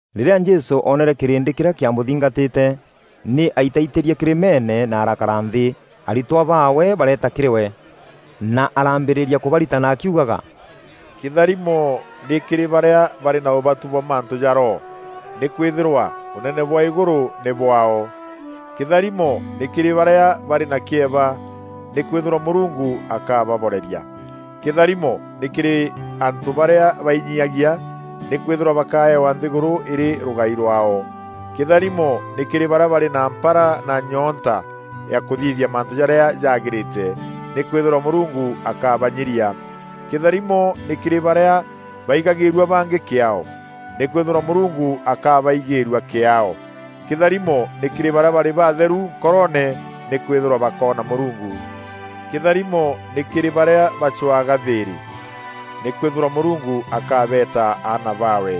Rîrîa Jesû oonere kîrîndî kîrîa kîamûthingatîte, nî aitaitîrie kîrîmeene na arakara nthî. Aritwa baawe bareeta kîrî we, na arambîrîîria kûbaritana akiugaga: “Kîtharimo nî kîrî barîa barî na ûbatu bwa mantû ja Roho, nîkwîthîrwa ûnene bwa îgûrû nî bwaao. Kîtharimo nî kîrî barîa barî na kîeba, nîkwîthîrwa Mûrungu akababoreria. Kîtharimo nî kîrî antû barîa bainyiagia, nîkwîthîrwa bakaewa nthîgûrû îrî rûgai rwaao. Kîtharimo nî kîrî barîa barî na mpara na nyoonta ya kûthithia mantû jarîa jagîrîte, nîkwîthîrwa Mûrungu akabanyiria. Kîtharimo nî kîrî barîa baigagîîrua bangî kîaao, nîkwîthîrwa Mûrungu akabaigîîrua kîaao. Kîtharimo nî kîrî barîa barî babatheru nkoroone, nîkwîthîrwa bakoona Mûrungu. Kîtharimo nî kîrî barîa bacwaga thîîrî, nîkwîthîrwa Mûrungu akabeeta aana baawe.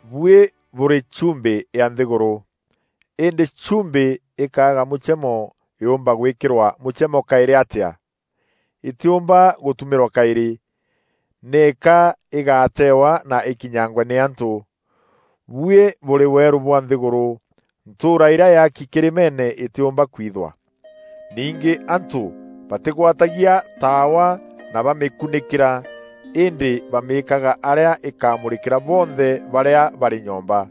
“Buî bûrî chumbî ya nthîgûrû. Îndî chumbî îkaaga mûchemo, yûûmba gwîkîrwa mûchemo kaîrî atîa? Îtîûmba gûtumîrwa kaîrî, nîka îgaatewa na îkinyangwe nî antû. “Buî bûrî weerû bwa nthîgûrû. Ntûûra îrîa yaaki kîrîmeene îtîumba kwithwa. Ningî antû batîgwatagia taawa na bamîkunîkîra, îndî bamîîkaga arîa îkamûrîkîra bonthe barîa barî nyomba.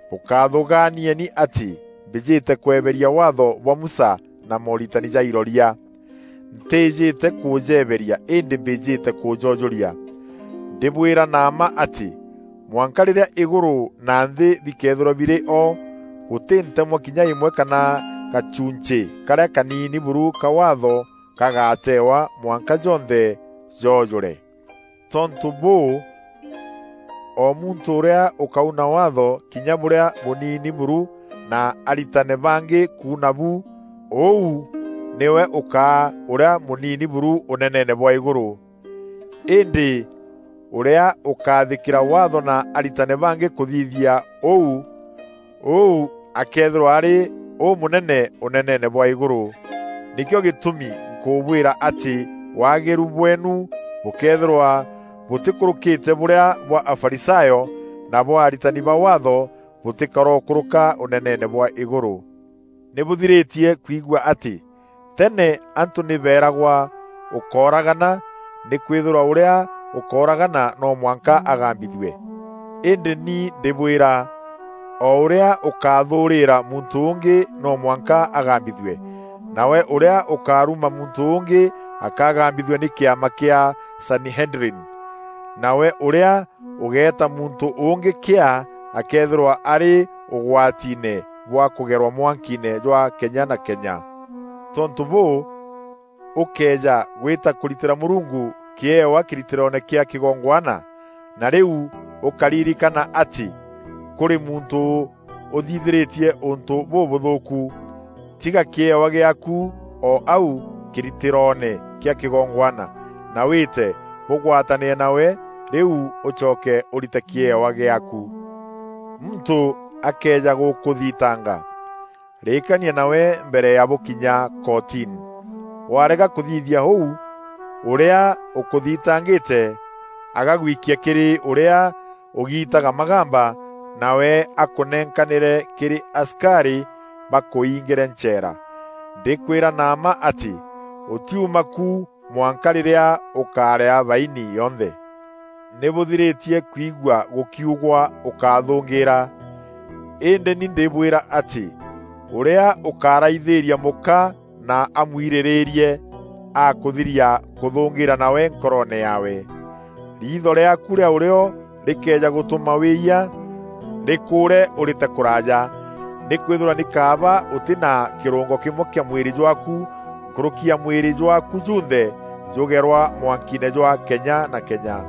“Bûkathûgaanieni atî mbîjîte kweberia Waatho bwa Musa na mooritani ja Iroria. Ntîîjîte kûjeberia îndî mbîjîte kûjoojûria. Ndîbwîra na mma atî, mwanka rîrîa îgûrû na nthî bikethîrwa birî o, gûtî ntemwa kinya îmwe kana gachuuncî karîa kaniini buru ka Waatho gagatewa, mwanka jonthe joojûre. Tontû bûû, o muntû ûrîa ûkauna Waatho kinya bûrîa bûniini buru na aritane bangî kuuna bu, ûu nîwe ûkaa ûrîa mûnini buru ûneneene bwa îgûrû. Îndî ûrîa ûkaathîkîra Waatho na aritane bangî kûthithia ûu, ûu akeethîrwa arî ûmûnene ûneneene bwa îgûrû. Nîkîo gîtûmi nkûbwîra atî waagîru bweenu bûkëethîrwa bûtîkûrûkîte bûrîa bwa Afarisayo na bwa aritani ba Waatho, bûtîkarokûrûka ûneneene bwa îgûrû.” “Nî bûthirîtie kwigua atî teene antû nî beeragwa, ‘Ûkóragana! Nîkwîthîrwa ûrîa ûkooragana no mwanka agambithue.’ Îndî ni ndîbwîra, o ûrîa ûkathûûrîîra muntû ûngî, no mwanka agambithue. Nawe ûrîa ûkaruma muntû ûngî akagambîthua nî kîama kîa sanihedrini. Nawe ûrîa ûgeeta muntû ûngî ‘Kîaa’ akeethîrwa arî ûgwatiine bwa kûgerwa mwankiine jwa kenya na kenya. Tontû bûû, ûkëeja gwîta kûritîra Mûrungu kîewa kîritîroone kîa kîgongwana, na rîu ûkaririkana atî kûrî muntû ûthithîrîtie ûntû bûbûthûûku, tiga kîewa gîaaku o au kîritîroone kîa kîgongwana, na wîte bûgwatanîre nawe, rîu ûcoke ûrite kîewa gîaaku. Muntû akëeja gûkûthitanga, rîkania nawe mbere ya bûkinya kotini. Warega kûthithia ûu ûrîa ûkûthitangîte agagwikia kîrî ûrîa ûgitaga magamba, nawe akûnenkanîre kîrî asikarî bakûingîre ncheera. Ndîkwîra na mma atî, ûtiuma ku mwanka rîrîa ûkarîa baini yonthe.” “Nî bûthirîtie kwigua gûkiugwa, ‘Ûkáthûngîîra’ Îndî ni ndîbwîra atî, ûrîa ûkaraithîîria mûka na amwirîrîîrie, akûthiria kûthûngîîra nawe nkoroone yaawe. Riitho rîaaku rîa ûrîo rîkëeja gûtûma wîîyia, rîkûûre ûrîte kûraaja. Nîkwîthîrwa nî kaaba ûtî na kîrûngo kîmwe kîa mwîrî jwaaku nkûrûki ya mwîrî jwaaku junthe jûgerwa mwankiine jwa kenya na kenya.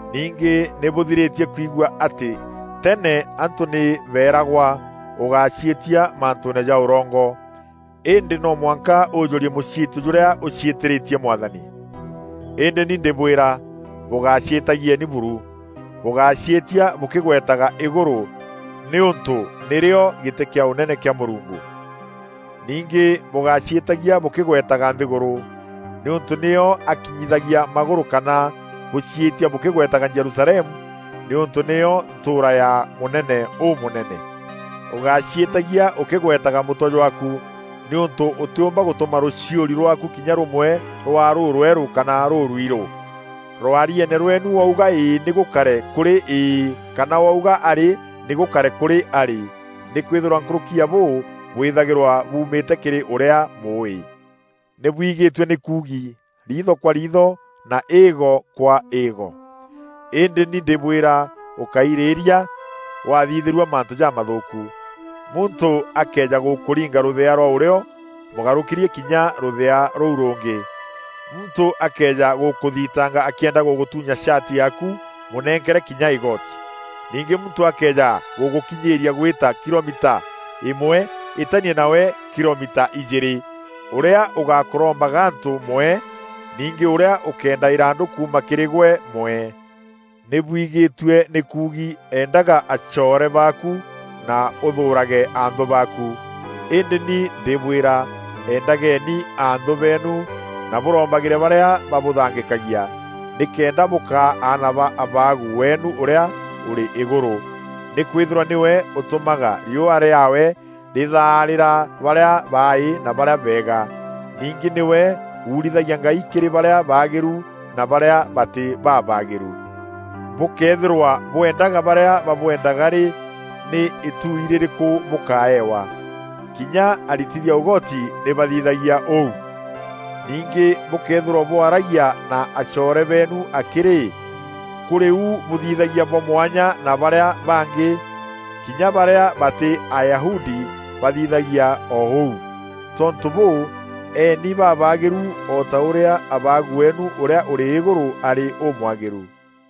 “Ningî nî bûthirîtie kwigua atî teene antû nî beeragwa: ‘Ûgáciîtia mantûûne ja ûrongo, îndî no mwanka ûjûrie mûciîtio jûrîa ûciîtîrîtie Mwathani.’ Îndî ni ndîbwîra, bûgáciîtagieni buru. Bûgáciîtia bûkîgwetaga îgûrû, nîûntû nîrîo gîtî kîa ûnene kîa Mûrungu. Ningî bûgáciîtagia bûkîgwetaga nthîgûrû, nîûntû nîyo akinyithagia magûrû kana bûciîtia bûkîgwetaga Jerusalemu, nîûntû nîyo ntûûra ya mûnene ûmûnene. Ûgáciîtagia ûkîgwetaga mûtwe jwaaku nîûntû ûtîûmba gûtûma rûchiûri rwaaku kinya rûmwe rwaa rûrwerû kana rûrwirû. Rwarieene rweenu, wauga ‘Îî’ nî gûkare kûrî ‘Iî’ kana wauga ‘Arî’ nî gûkare kûrî ‘arî.’ Nîkwîthîrwa nkûrûki ya bûu bwîthagîrwa buumîte kîrî ûrîa Mûûî.” “Nîbwigîtue nî kuugi, ‘Riitho kwa riitho, na îîgo kwa îîgo.’ Îndî ni ndîbwîra ûkairîîria wathithîrua mantû jamathûûku. Muntû akëeja gûkûringa rûthea rwa ûrîo, mûgarûkîrie kinya rûthea rûu rûngî. Muntû akëeja gûkûthitanga akîenda gûgûtûnya shati yaaku, mûnenkere kinya îgoti. Ningî muntû akëeja gûgûkinyîîria gwîta kilomita îmwe, îtania nawe kilomita ijîîrî. Ûrîa ûgakûromba gantû mwee. Ningî ûrîa ûkeenda îrandû kuuma kîrî gwe, mwee.” “Nî bwigîtue nî kuugi, ‘Endaga acoore baaku, na ûthûûrage anthû baaku.’ Îndî ni ndîbwîra, endageni anthû beenu, na bûrombagîre barîa babûthangîkagia, nîkenda bûkaa aana ba Abaagu weenu ûrîa ûrî îgûrû. Nîkwîthîrwa nîwe ûtûmaga riûa rîaawe rîthaarîra barîa baaî na barîa beega. Ningî nîwe uurithagia ngai kîrî barîa baagîru na barîa batî babaagîru. Bûkëethîrwa bwendaga barîa babwendaga rî, nî îtuuî rîrîkû bûkaewa? Kinya aritithia ûgoti nî bathithagia ûû. Ningî bûkëethîrwa bwaragia na acoore beenu akî rî, kûrî u bûthithagia bwa mwanya na barîa bangî? Kinya barîa batî Ayahudi, bathithagia o ûu. Tontû bûû, eeni babaagîru o ta ûrîa Abaagu weenu ûrîa ûrî îgûrû arî ûmwagîru.”